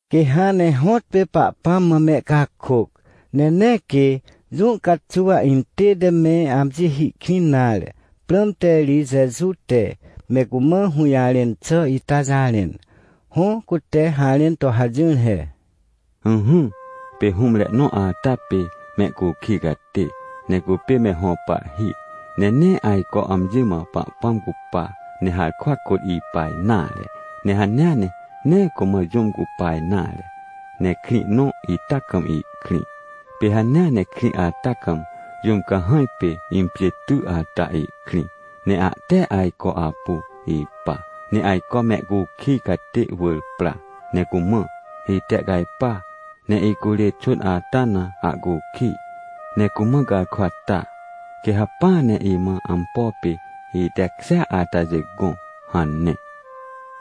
Quê hãn ne hõtpê Pahpãm mã mehcakôc, ne nee quê jũ caxuw intête me amji hi kwĩn nare, prãmte ri Jeju te me cumã hũjarẽn xà ita jarẽn. Hõ, cute harẽn to hajỹr he: ― Ỹhỹ, pê hũmre nõ ata pê mehcukij catê, ne cupê me hõ pahhi. Ne nee ajco amji mã Pahpãm cupa, ne harkwa kôt ipa nare. Ne hanea ne nee cumã jũm cupa nare, ne krĩ nõ ita kam ihkrĩ. Pê hanea ne krĩ ata kam jũm cahãj pê impjên ty ata ihkrĩ. Ne ahte ajco apu ipa. Ne ajco mehcukij catê wỳr pra ne cumã: “Itehcajpa, ne icurê xwỳn ata na ahcukij, ne cumã garkwa ta, quê hacpỹa ne imã ampo pê itekjêa atajê gõ” hane.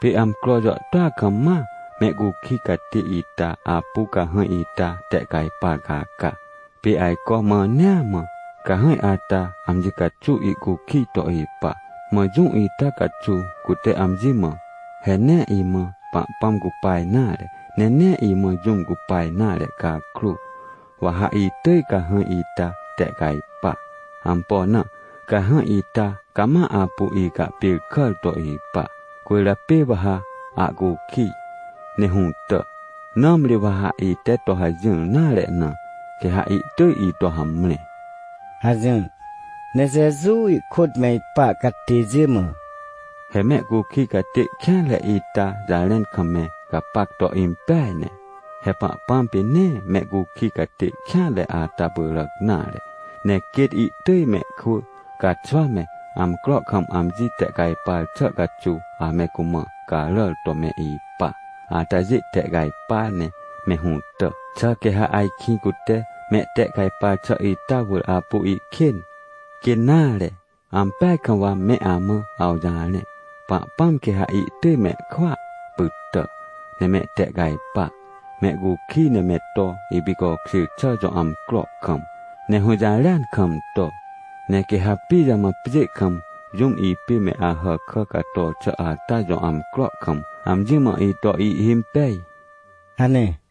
― Pê amcro jàhtôa kam ma mehcukij catê ita apu cahãj ita tehcajpar caca. Pê ajco mãnea mã cahãj ata amji caxuw ihcukij to ipa. Mã jũ ita caxuw cute amji mã: “He nee imã Pahpãm cupa nare, ne nee imã jũm cupa nare cakrô, wa ha itỳj cahãj ita tehcajpa. Ampo na? Cahãj ita cama apu icahpêrkàr to ipa, cwỳrjapê wa ha ahcukij ne hũtà. Nãmri wa ha ite to hajỹr nare na, quê ha ihtỳj ito hamre” ― hajỹr. Ne Jeju ihkôt me ipa catêjê mã: ― He mehcukij catê kêanre ita jarẽn kam me gapac to impeaj ne. He Pahpãm pê nee mehcukij catê kêanre ata pyràc nare. Ne quêt ihtỳj mehkwỳ, caxwa me, amcro kam amji tehcajpar xà caxuw ame cumã caràr to me ipa atajê tehcajpa ne me hũtà. Xà quê ha ajkĩ cute mehtehcajpar xà ita wỳr apu ihkên? Quê nare! Ampeaj kam wa me amã awjarẽ, Pahpãm quê ha ihtỳj mehkwỳa pytà, ne mehtehcajpa, mehcukij ne me to ipicokjêr xà jõ amcro kam, ne hũjarêan kam to. ― Ne quê ha pijamã pjê kam jũm ipê me Ahàkà cator xà ata jõ amcro kam, amji mã ito ihhimpej? ― hane.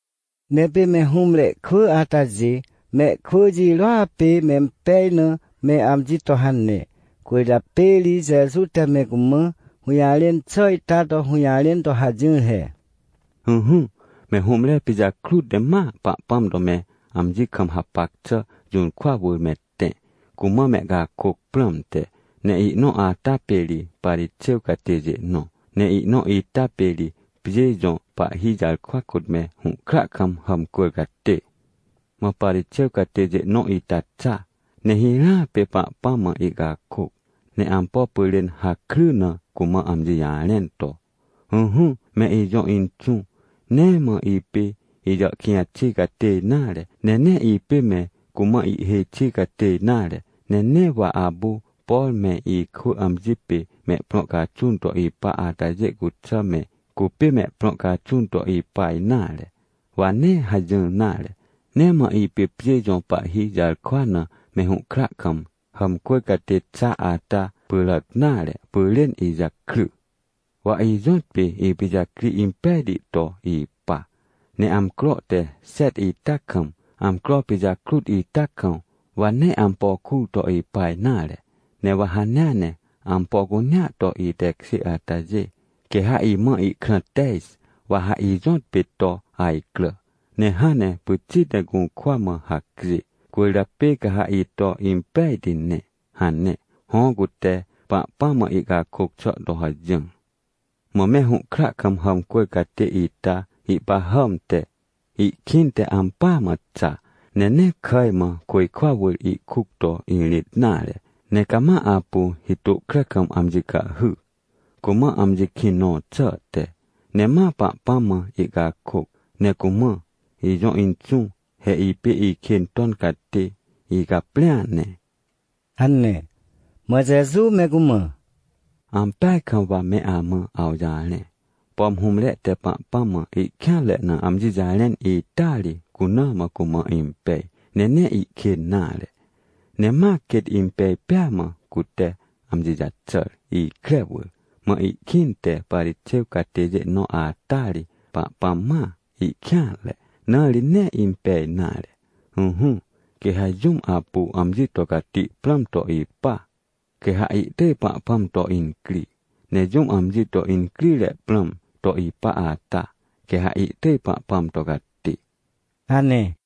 Ne pê me hũmre kwỳ atajê mehkwỳ jirôa pê mempej na me amji to hane. Cwỳrjapê ri Jeju te me cumã hũjarẽn xà ita to hũjarẽn to hajỹr he: ― Ỹhỹ, me hũmre pijakrut ne ma Pahpãm to me amji kam hapac xà jũrkwa wỳr me tẽ, cumã mehcakôc prãmte. Ne ihnõ ata pê ri Parixêw catêjê nõ, ne ihnõ ita pê ri pjê jõ pahhi jarkwa kôt me hũhkra kam hàmcwỳr catê. ― Mã Parixêw catêjê nõ ita xa, ne hirãa pê Pahpãm mã ihcakôc, ne ampo pyrên hakry na cumã amji jarẽn to: “Ỹhỹ, me ijõ Inxũ, nee mã ipê ijàhkĩj xi catê nare, ne nee ipê me cumã ihêj xi catê nare, ne nee wa apu, por me ikwỳ amji pê mehprõ caxun to ipa atajê cuxà me cupê mehprõ caxun to ipa nare, wa nee hajỹr nare. Nee mã ipê pjê jõ pahhi jarkwa na me hũhkra kam hàmcwỳr catê xa ata pyràc nare pyrên ijakry. Wa ijõtpê ipijacri impejti to ipa, ne amcro te xet ita kam, amcro pijakrut ita kam, wa nee ampo kur to ipa nare. Ne wa hanea ne ampo cunea to itekjê atajê, quê ha imã ihkrã tej wa ha ijõtpê to ajcrà, ne hãn ne pyxit ne gũrkwa mã hacjê. Cwỳrjapê ca ha ito impejti ne” hane. Hõ, cute Pahpãm mã ihcakôc xà to hajỹr. ― Mã me hũhkra kam hàmcwỳr catê ita ihpahàmte, ihkĩnte ampỳa mã xa, ne nee kàj mã, côjkwa wỳr, ihkuc to irĩt nare. Ne cama apu hitôhkre kam amji cahhy, cumã amji kĩn nõ xàhte, ne ma Pahpãm mã ihcakôc ne cumã: “Ijõ Inxũ, he ipê ikên ton catê, icaprĩa ne” ― hane. Mã Jeju me cumã: ― Ampeaj kam wa me amã awjarẽ. Pom hũmre te Pahpãm mã ihkêanre na amji jarẽn ita ri, cuna mã cumã impej, ne nee ihkên nare. Ne ma quêt impej pêa mã, cute amji jaxàr ikre wỳr. Mã ihkĩnte Parixêw catêjê nõ ata ri Pahpãm mãa ihkêanre, na ri nee impej nare. ― Ỹhỹ, quê ha jũm apu amji to cati prãm to ipa, quê ha ihtỳj Pahpãm to incri. Ne jũm amji to incrire prãm to ipa ata, quê ha ihtỳj Pahpãm to cati ― hane.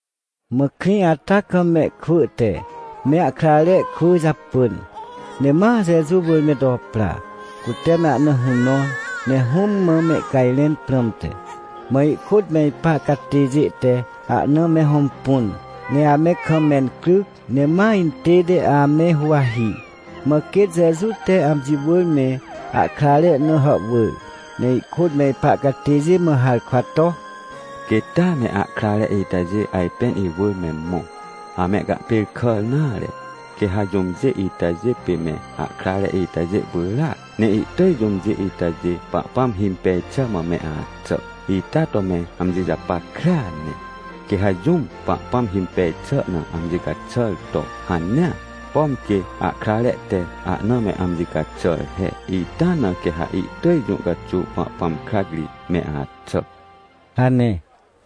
Mã krĩ ata kam mehkwỳ te me ahkrare kwỳ japỳn, ne ma Jeju wỳr me to pra, cute me ahna hũ nõr, ne Hũm mã mehcajrẽn prãmte. Mã ihkôt me ipa catêjê te ahna me hõmpun, ne ame kam mencryc, ne ma intête ame huwahi. Mã quêt Jeju te amji wỳr me ahkrare na hàhwỳr, ne ihkôt me ipa catêjê mã harkwa to: ― Quêt taa me ahkrare itajê ajpên iwỳr me mõ, amehcahpêrkàr nare. Quê ha jũmjê itajê pê me ahkrare itajê pyràac, ne ihtỳj jũmjê itajê Pahpãm himpej xà mã me axà. Ita to me amji japackrea ne, quê ha jũm Pahpãm himpej xà na amji caxàr to hanea, pom quê ahkrare te ahna me amji caxàr he, ita na quê ha ihtỳj jũ caxuw Pahpãm krac ri me axà ― hane.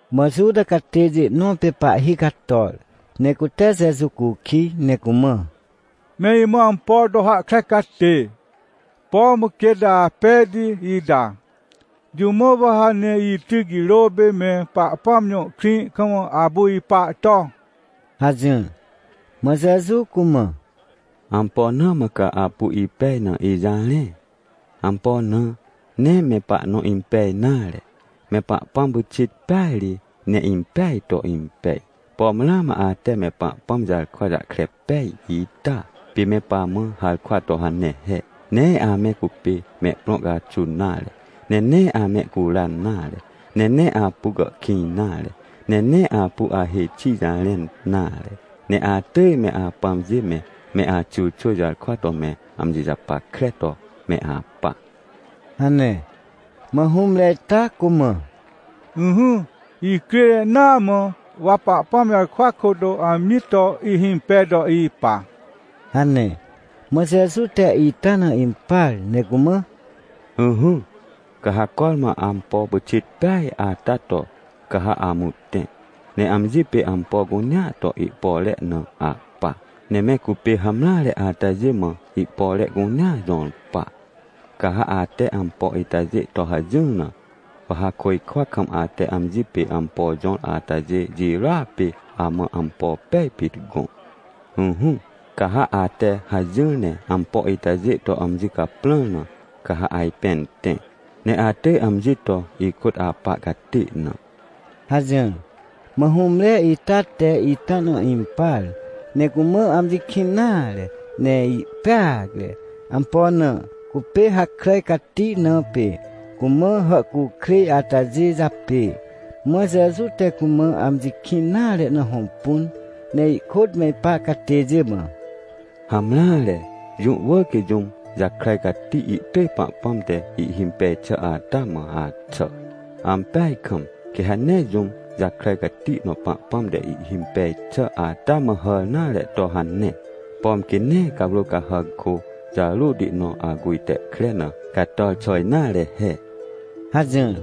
Mã Juta catêjê nõ pê pahhi cator, ne cute Jeju cukij, ne cumã: ― Me imã ampo to hahkre catê, pom quêt apejti ita, jũ mã wa ha ne ityc jirô pê me Pahpãm jõ krĩ kam apu ipa to? ― hajỹr. Mã Jeju cumã: ― Ampo na mã ca apu ipej na ijarẽ? Ampo na? Nee me pahnõ impej nare. Me Pahpãm pyxit peaj ri ne impeaj to impej. Pom ramã ate me Pahpãm jarkwa jahkre pej ita, pê me pamã harkwa to hane he: “Nee ame cupê mehprõ caxun nare, ne nee amehcuran nare, ne nee apu gàhkĩj nare, ne nee apu ahêj xi jarẽn nare, ne atỳj me apãmjê me, me axyrxwỳ jarkwa to me amji japackre to me apa” ― hane. Mã hũmre ita cumã: ― Ỹhỹ, icrire naa mã, wa Pahpãm jarkwa kôt amji to ihimpej to ipa ― hane. Mã Jeju te ita na impar ne cumã: ― Ỹhỹ, ca ha cormã ampo pyxit peaj ata to. Ca ha amũ tẽ, ne amji pê ampo cunea to ihpore na ahpa, ne me cupê hamreare atajê mã ihpore cunea jõr pa. Ca ha ate ampo itajê to hajỹr na, wa ha côjkwa kam ate amji pê ampo jõr atajê jirôa pê amã ampo pej pit gõ. Ỹhỹ, ca ha ate hajỹr ne ampo itajê to amji caprãr na, ca ha ajpên tẽ, ne atỳj amji to ikôt apa catê na ― hajỹr. Mã hũmre ita te ita na impar, ne cumã amji kĩn nare, ne ihpeacre. Ampo na? Cupê hakràj cati na pê cumã hàhcukrêj atajê japê. Mã Jeju te cumã amji kĩn nare na hõmpun, ne ihkôt me ipa catêjê mã: ― Hamreare, jũ wỳr quê jũm jakràj cati ihtỳj Pahpãm te ihhimpej xà ata mã axà. Ampeaj kam, quê ha nee jũm jakràj cati nõ Pahpãm te ihhimpej xà ata mã hàr nare to hane, pom quê nee cawrô cahàc kô jarôti nõ aguj te kre na cator xà nare he ― hajỹr.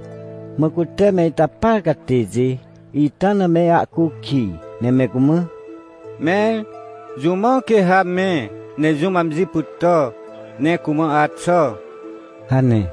Mã cute me ita par catêjê ita na me ahcukij, ne me cumã: ― Mẽr, jũ mã quê ha me, ne jũm amji pytà, ne cumã axà? ― hane.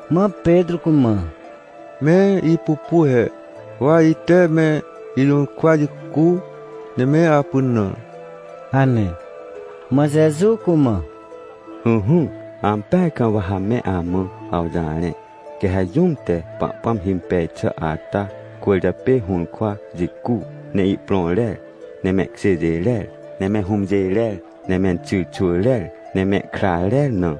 Mã Petrô cumã: ― Me ipupu he, wa ite me ijũrkwa jicu, ne me apynãr ― hane. Mã Jeju cumã: ― Ỹhỹ, ampeaj kam wa ha me amã awjarẽ, quê ha jũm te Pahpãm himpej xà ata cwỳrjapê hũrkwa jicu, ne ihprõ rer, ne mehkjêjê rer, ne me hũmjê rer, ne menxyrxwỳ rer, ne mehkra rer na,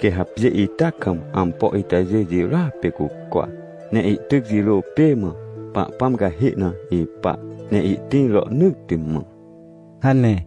quê ha pjê ita kam ampo itajê jirôa pê cucwa, ne ihtyc jirô pê mã Pahpãm cahê na ipa, ne ihtĩr rohnỳtti mã ― hane.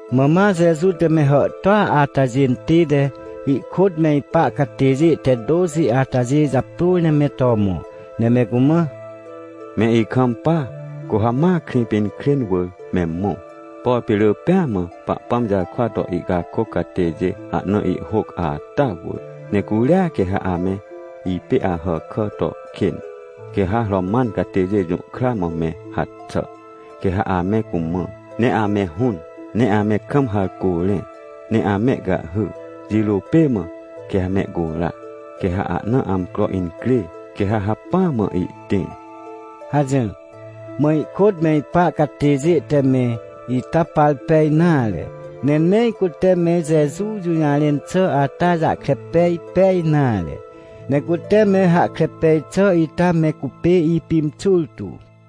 Mã ma Jeju te me hàhtôa atajê intête ihkôt me ipa catêjê te tôxi atajê japrôr ne me to mõ, ne me cumã: ― Me ikampa! Cu ha ma Krĩpinkrên wỳr me mõ, por pê rỳ pêa mã Pahpãm jarkwa to ihcakôc catêjê ahna ihhôc ata wỳr, ne curia quê ha ame ipê Ahàkà to kên. Quê ha Roman catêjê jũhkra mã me haxà, quê ha ame cumã, ne ame hũn, ne ame kam harcô rẽ, ne amehcahhy, jirô pê mã quê ha mehcura. Quê ha ahna amcro incrê, quê ha hacpỹa mã ihtĩr ― hajỹr. Mã ihkôt me ipa catêjê te me ita par pej nare, ne nee cute me Jeju jũjarẽn xà ata jahkre pej pej nare. Ne cute me hahkre pej xà ita me cupê ipimxur tu.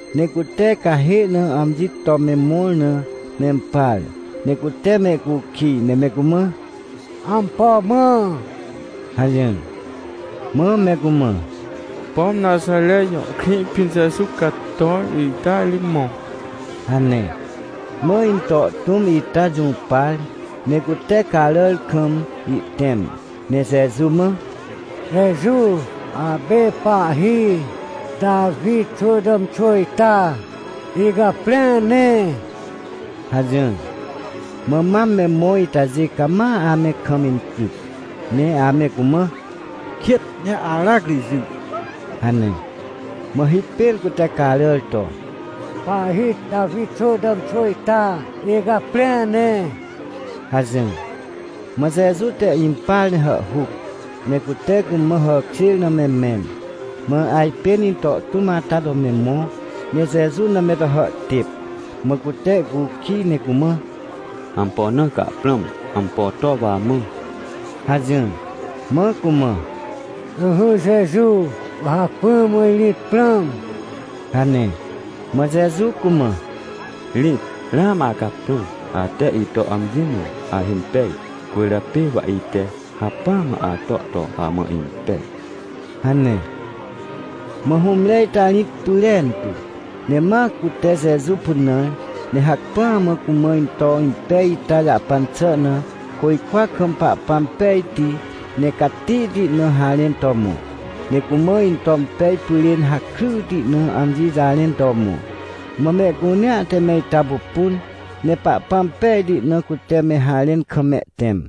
Ne cute cahê na amji to me mõr na mempar, ne cute mehcukij, ne me cumã: ― Ampo mã? ― hajỹr. Mã me cumã: ― Pom Naxare jõ krĩ pĩn Jeju cator ita ri mõ ― hane. Mã into tũm ita jũpar, ne cute caràr kam ihtẽm, ne Jeju mã: ― Jeju! Apê pahhi Tawi xwỳ tàmxwỳ ita, icaprĩa ne! ― hajỹr. Mã mam me mõ itajê cama ame kam incryc, ne ame cumã: ― Kêt! Ne aracri jỹ! ― hane. Mã hipêr cute caràr to: ― Pahhi Tawi xwỳ tàmxwỳ ita, icaprĩa ne! ― hajỹr. Mã Jeju te impar ne hàhhuc, ne cute cumã hàkjêr na me mẽn. Mã ajpên into tũm ata to me mõ, ne Jeju na me to hàhtêp. Mã cute ihcukij ne cumã: ― Ampo na ca prãm? Ampo to wa amã? ― hajỹr. Mã cumã: ― Ỹhỹ, Jeju, wa hacpỹa mã irĩt prãm ― hane. Mã Jeju cumã: ― Rĩt! Ramã acaprãr. Ate ito amji mã ahimpej, cwỳrjapê wa ite hacpỹa mã ato to amã impej ― hane. Mã hũmre ita irĩt pyrentu, ne ma cute Jeju pynãr, ne hacpỹa mã cumã into impej ita jahpan xà na côjkwa kam Pahpãm pejti, ne catihti na harẽn to mõ, ne cumã into impej pyrên hakryti na amji jarẽn to mõ. Mã mehcunea te me ita pupun, ne Pahpãm pejti na cute me harẽn kam mehtẽm.